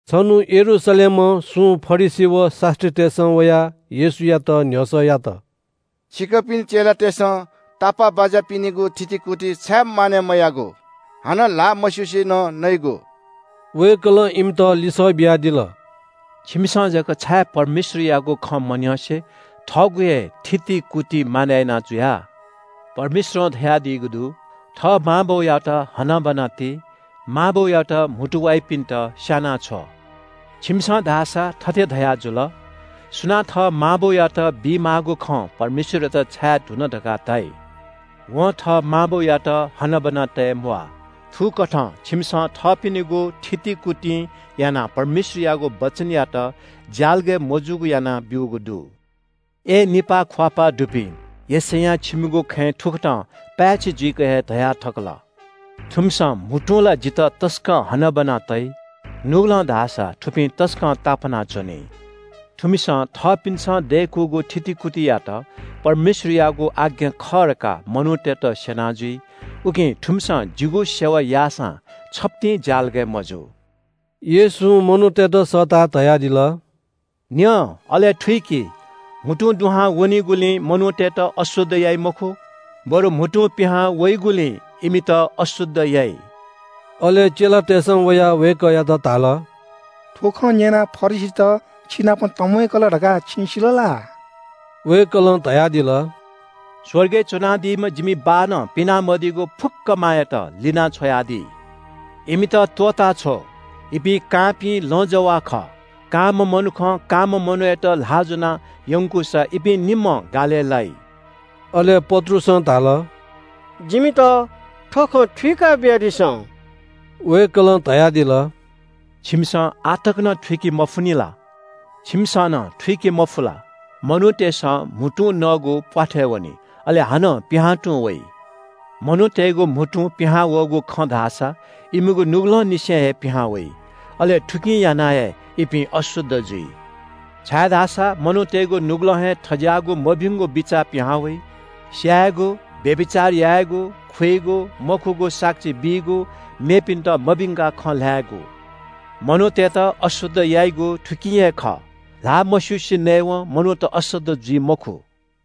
छन्‍हु यरूशलेमं सुं फरिसी व शास्‍त्रीतय्‌सं वयाः येशूयात न्‍ह्यसः यात – “छिकपिनि चेलातय्‌सं तापाःबाज्‍यापिनिगु थितिकुति छाय् मानय् मयाःगु? हानं ल्‍हाः मस्‍युसे नं नइगु?” वय्‌कलं इमित लिसः बियादिल – “छिमिसं जक छाय् परमेश्‍वरयागु खँ मन्‍यंसे थःगु हे थितिकुति मानय् याना जुया? परमेश्‍वरं धयादीगु दु – ‘थः मां बौयात हनाबना ति। मां बौयात म्‍हुतु वाइपिन्‍त स्‍यानाछ्व।’ छिमिसं धाःसा थथे धयाजुल – ‘सुनां थः मां बौयात बीमाःगु खँ परमेश्‍वरयात छाये धुन धकाः धाइ, वं थः मां बौयात हनाबना तये म्‍वाः।’ थुकथं छिमिसं थःपिनिगु थितिकुतिं यानाः परमेश्‍वरयागु वचनयात ज्‍यालगय् मजूगु यानाब्‍यूगु दु। अय् निपाः ख्‍वाःपाः दुपिं, यशैयां छिमिगु खँय् थुकथं पाय्‌छि जुइक हे धया थकल – “‘थुमिसं म्‍हुतुं ला जितः तसकं हनाबना तइ। नुगलं धाःसा थुपिं तसकं तापाना च्‍वनी। थुमिसं थःपिन्‍सं दय्‌कूगु थितिकुतियात परमेश्‍वरयागु आज्ञा खः धकाः मनूतय्‌त स्‍यना जुइ। उकिं थुमिसं जिगु सेवा याःसां छप्‍तिं ज्‍यालगय् मजू।’” येशूं मनूतय्‌त सःताः धयादिल – “न्‍यँ अले थुइकि। म्‍हुतुं दुहां वनीगुलिं मनूतय्‌त अशुद्ध याइ मखु, बरु म्‍हुतुं पिहां वइगुलिं इमित अशुद्ध याइ।” अले चेलातय्‌सं वयाः वय्‌कःयात धाल – “थ्‍व खँ न्‍यनाः फरिसीत छिनाप तंम्‍वय्‌कल धकाः छिं सिल ला?” वय्‌कलं धयादिल – “स्‍वर्गय् च्‍वनादीम्‍ह जिमि बाःनं पिना मदीगु फुक्‍क मायात लिनाछ्वयादी। इमित त्‍वःताछ्व। इपिं कांपिं लँजवाः खः। कांम्‍ह मनुखं कांम्‍ह मनूयात ल्‍हाः ज्‍वनाः यंकूसा इपिं निम्‍हं गालय् लाइ।” अले पत्रुसं धाल – “जिमित थ्‍व खँ थुइका बियादिसँ।” वय्‌कलं धयादिल – “छिमिसं आः तकं थुइके मफुनि ला? छिमिसं नं थुइके मफु ला? मनूतय्‌सं म्‍हुतुं नःगु प्‍वाथय् वनी, अले हानं पिहां तुं वइ। मनूतय्‌गु म्‍हुतुं पिहां वःगु खँ धाःसा इमिगु नुगलंनिसें हे पिहां वइ। अले थुकिं यानाः हे इपिं अशुद्ध जुइ। छाय्‌धाःसा मनूतय्‌गु नुगलं हे थज्‍याःगु मभिंगु बिचाः पिहां वइ – स्‍यायेगु, व्‍यभिचार यायेगु, खुइगु, मखुगु साक्षी बीगु, मेपिन्‍त मभिंकाः खँ ल्‍हायेगु। मनूतय्‌त अशुद्ध याइगु थुकिं हे खः। ल्‍हाः मस्‍युसे नयेवं मनूत अशुद्ध जुइ मखु।”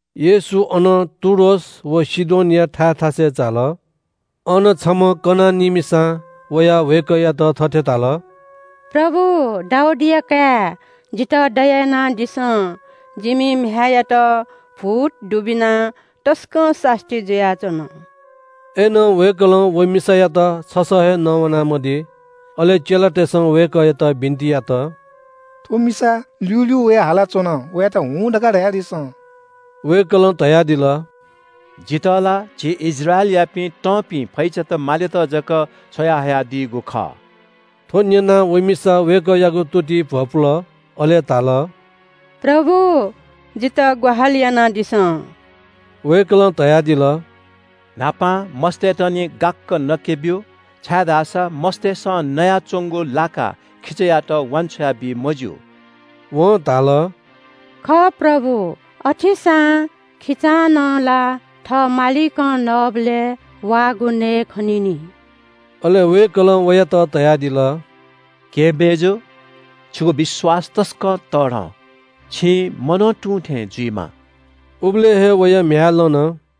येशू अनं टुरोस व सीदोनया थाय् थासय् झाल। अन छम्‍ह कनानी मिसां वयाः वय्‌कःयात थथे धाल – “प्रभु, दाऊदया काय्, जितः दया यानादिसँ। जिमि म्‍ह्याय्‌यात भूत दुबिनाः तसकं सास्‍ती जुयाच्‍वन।” अय्‌नं वय्‌कलं व मिसायात छसः हे नवाना मदी। अले चेलातय्‌सं वय्‌कःयात बिन्‍ति यात – “थ्‍व मिसा ल्‍यूल्‍यू वयाः हालाच्‍वन, वयात ‘हुँ’ धकाः धयादिसँ।” वय्‌कलं धयादिल – “जितः ला झी इस्राएलयापिं तंपिं फैचात मालेत जक छ्वयाहयादीगु खः।” थ्‍व न्‍यनाः व मिसा वय्‌कःयागु तुतिइ भ्‍वपुल। अले धाल – “प्रभु, जितः ग्‍वाहालि यानादिसँ।” वय्‌कलं धयादिल – “न्‍हापां मस्‍तय्‌त निं गाक्‍क नके ब्‍यु, छाय्‌धाःसा मस्‍तय्‌सं नयाच्‍वंगु लाकाः खिचायात वान्‍छ्वया बी मज्‍यू।” वं धाल – “खः प्रभु, अथेसां खिचां नं ला थः मालिकं नःबलय् वाःगु नयेखनी नि।” अले वय्‌कलं वयात धयादिल – “केहेँ मय्‌जु, छिगु विश्‍वास तसकं तःधं, छिं मनं तुं थें जुइमा।” उबलय् हे वया म्‍ह्याय् लन।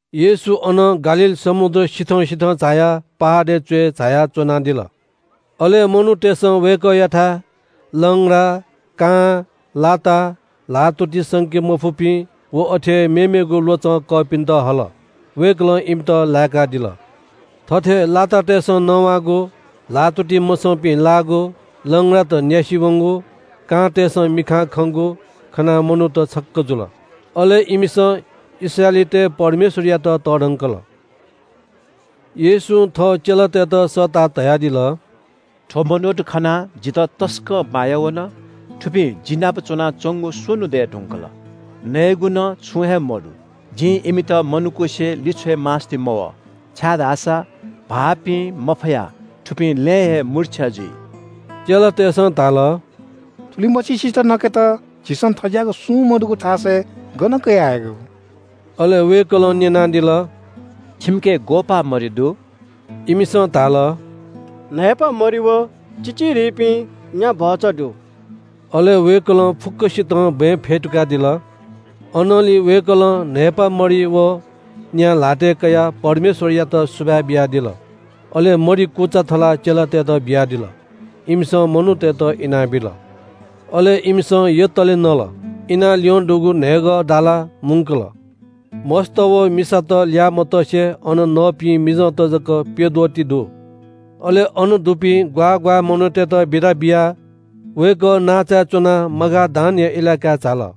येशू अनं गालील समुद्र सिथं सिथं झायाः पहाडय् च्‍वय् झायाः च्‍वनादिल। अले मनूतय्‌सं वय्‌कःयाथाय् लंग्रा, कां, लाता, ल्‍हाःतुति संके मफुपिं व अथे हे मेमेगु ल्‍वचं कःपिन्‍त हल। वय्‌कलं इमित लाय्‌कादिल। थथे लातातय्‌सं नवाःगु, ल्‍हाःतुति मसंपिं लाःगु, लंग्रात न्‍यासि वंगु, कांतय्‌सं मिखां खंगु खनाः मनूत छक्‍क जुल। अले इमिसं इस्राएलीतय् परमेश्‍वरयात तःधंकल। येशूं थः चेलातय्‌त सःताः धयादिल – “थ्‍व मनूत खनाः जितः तसकं माया वन। थुपिं जि नाप च्‍वनाच्‍वंगु स्‍वन्‍हु दये धुंकल। नयेगु नं छुं हे मदु। जिं इमित मनकुसे लिछ्वय् मास्‍ति मवः, छाय्‌धाःसा भाःपी मफयाः थुपिं लँय् हे मूर्छा जुइ।” चेलातय्‌सं धाल – “थुलिमछिसित नकेत झीसं थज्‍याःगु सुं मदुगु थासय् गन कयाः हयेगु?” अले वय्‌कलं न्‍यनादिल – “छिमिके ग्‍वःपाः मरि दु?” इमिसं धाल – “न्‍हय्‌पाः मरि व चिचिधिपिं न्‍या भचा दु।” अले वय्‌कलं फुक्‍कसितं बँय् फ्‍यतुकादिल। अनंलि वय्‌कलं न्‍हय्‌पा मरि व न्‍या ल्‍हातय् कयाः परमेश्‍वरयात सुभाय् बियादिल। अले मरि कुचा थलाः चेलातय्‌त बियादिल। इमिसं मनूतय्‌त इनाबिल। अले इमिसं यतले नल। इनाः ल्‍यं दुगु न्‍हय्‌ग दाला मुंकल। मस्‍त व मिसात ल्‍याः मतसे अन नःपिं मिजंत जक प्‍यद्वः ति दु। अले अन दुपिं ग्‍वाः ग्‍वाः मनूतय्‌त बिदा बियाः वय्‌कः नांचाय् च्‍वनाः मगादानया इलाकाय् झाल।